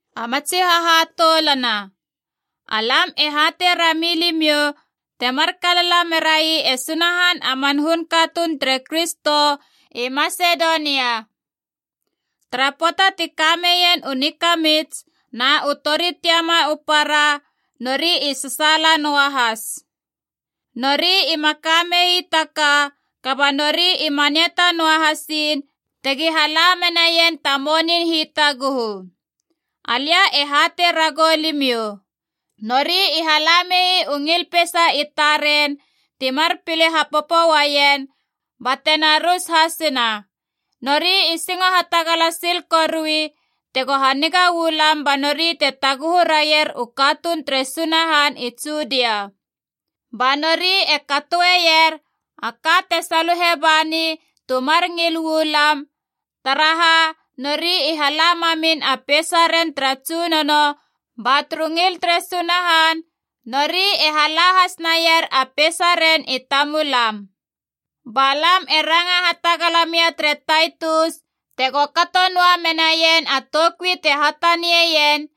A matsi hahatoulana, alam e hatei rami limiou temar kalala merai e Sunahan a man hun katuun tere Kristo i Masedonia. Tara pöata ti kameien u nikamits na u tori tiama u para, nori i sasaala noa has. Nori ima ka mei ta ka, kaba nori i maniata noa hasiin tegi hala menaien ta monin hitaguhu. Alia e hatei ragou limiou, nori i hala mei u ngil peisa i taren timar pile hapopo uaien bate na rus hasina. Nori i singo hatagala sil korui tego haniga uu lam ba nori te taguhu raier u katuun tere Sunahan i Judia. Ba nori e katoeier a ka te saluhe bani tu mar ngil uu lam, taraha nori i hala mamin a peisaren tara Tsunono ba turu ngil tere Sunahan, nori e hala has naier a peisaren i tamulam. Ba lam e ranga hatagala mia tere Taitus tego kato noa menaien a toukui te hatanieien,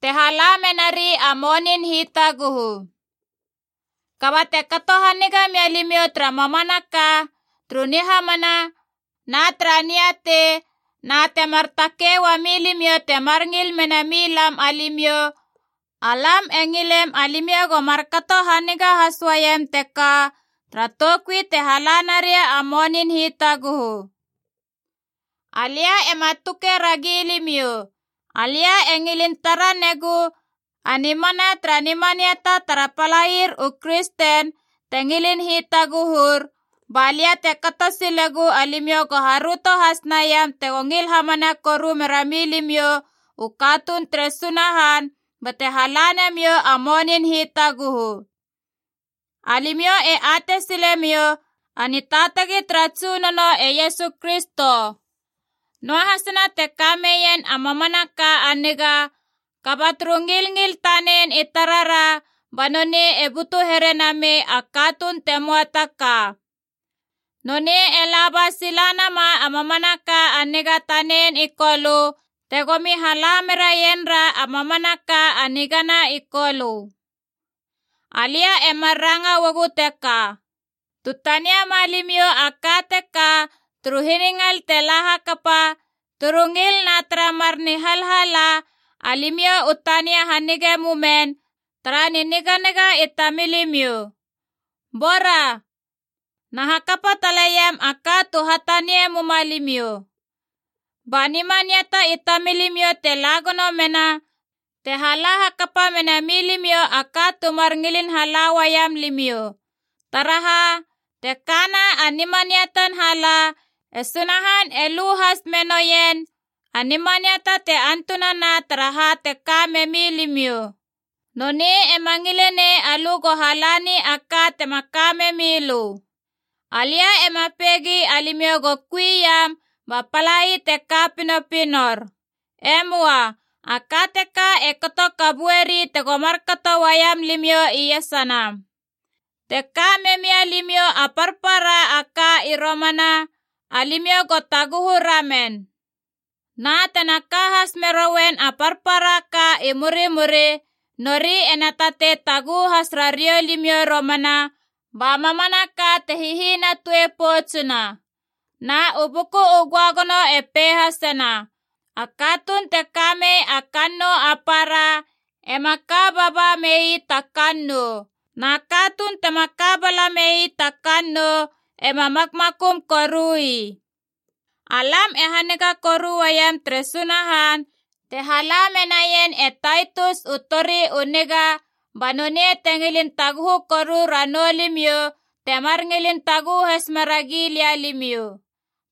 te hala menari a monin hitaguhu. Kaba te kato haniga mia limiou tara mamanaka, turu nihamana na tara niatei, na temar takei uami limiou temar ngil mena mi lam alimiou, alam e ngilem alimiou go markato haniga has uaiam teka tara toukui te hala naria a monin hitaguhu. Alia ema tuke ragi limiou, alia e ngilin tara negu a nimana tara nimaniata tara palair u kristen te ngilin hitaguhur, balia te kato silegu alimiou go haröto has naiam tego ngil hamana koru mera milimiou u katuun tere Sunahan bate hala namiou a monin hitaguhu. Alimiou e atei silemiou a nitaatagi tara Tsunono e Iesu Kristo. Noahasina te ka meien a mamanaka a niga, kaba turu ngilngil tanen i tarara ba nonei e butu here namei a katuun te möa ta ka. Nonei e laba sila nama a mamanaka a niga tanen i Kolö tegomi hala meraienra a mamanaka a nigana i Kolö. Alia e mar ranga uagu teka: tu taniema limiou a ka teka turu hiningal te la hakapa, turu ngil na tara mar nihalhala, alimiou u tania hanigei mumen tara niniganiga i tamilimiou. Bora, na hakapa taleiam a ka tu hatanie muma limiou. Ba nimaniata i tamilimiou te la gono mena te hala hakapa mena milimiou a ka tu mar ngilin hala uaiam limiou. Taraha, te kana a nimaniatan hala, e Sunahan e lu has me noien a nimaniata te antunana tara ha te ka memi limiou. Nonei ema ngile nei alö go halani a ka tema ka memilö. Alia ema peigi alimiou go kui iam ba palai te ka pinopinor. E möa. A ka teka e kato kabueri tego markato uaiam limiou iesana. Te ka memia limiou a parpara a ka i romana, alimiou go taguhu ramen. Na tena ka has meroien a parpara a ka i murimuri nori ena tatei taguhu has rariou limiou romana, ba mamanaka te hihinatue poutsuna. Na u Buku u Göagono e pei hasena, “A katuun te kamei a kannou a para ema ka baba mei ta kannou. Na katuun tema ka bala mei ta kannou ema makmakum korui.” Alam e haniga koru uaiem tere Sunahan te hala menaien e Taitus u tori u niga ba nonei te ngilin taguhu koru ranou limiou temar ngilin taguhu has meragi lia limiou.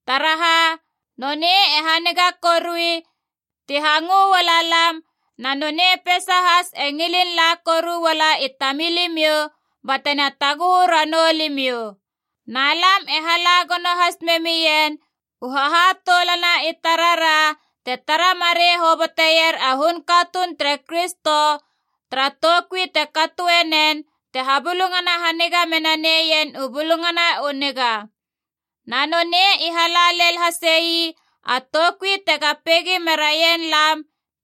Taraha, nonei e haniga korui ti hangö uala lam, na nonei peisa has e ngilin la koru uala i tamilimiou batena taguhu ranou limiou. Na lam e hala gono has memien u hahatoulana i tarara te tara marei hoboteier a hun katuun tere Kristo tara toukui te katoe nen te habulungana haniga mena neien u Bulungana u Niga. Na nonei i hala lel hase ii a toukui tega peigi meraien lam,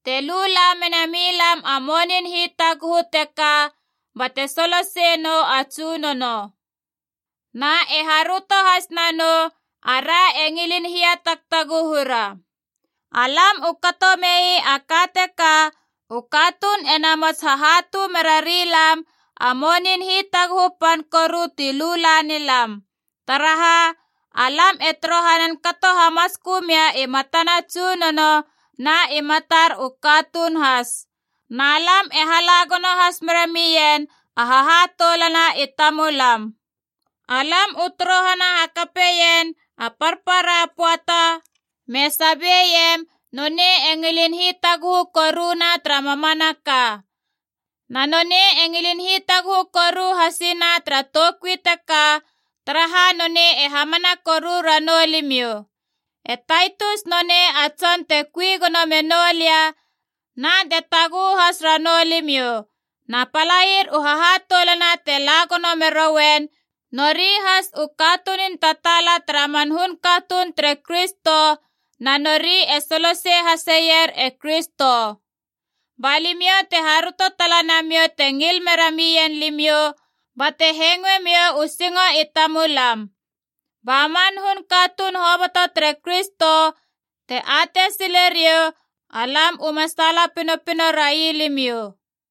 te lu la mena milam a monin hitaguhu teka bate soloseie nou a Tsunono. Na e haröto has nanou ara e ngilin hiatagtaguhura. Alam u kato mei a ka teka, u katuun ena mots hahatu merari lam a monin hitaguhu pan koru ti lu la ni lam. Taraha, alam e torohanan kato hamatskö mia i matana a Tsunono na i matar u katuun has. Na lam e hala gono has mera mien a hahatoulana i tamulam. Alam u torohana hakapeien a parpara pöata me sabeiem nonei e ngilin hitaguhu koruna tara mamanaka. Na nonei e ngilin hitaguhu koru hasina tara toukui teka, taraha nonei e hamana koru ranou limiou. E Taitus nonei a tson te kui gono menou lia na te taguhu has ranou limiou. Na palair u hahatoulana te la gono merouen, nori has u katunun tataala tara man hun katuun tere Kristo, na nori e solosei haseier e Kristo. Ba limiou te haröto tala namiou te ngil mera mien limiou bate hengoemiou u singo i tamulam. Ba man hun katuun hoboto tere Kristo te atei sileriou alam uma saala pinopino rai limiou.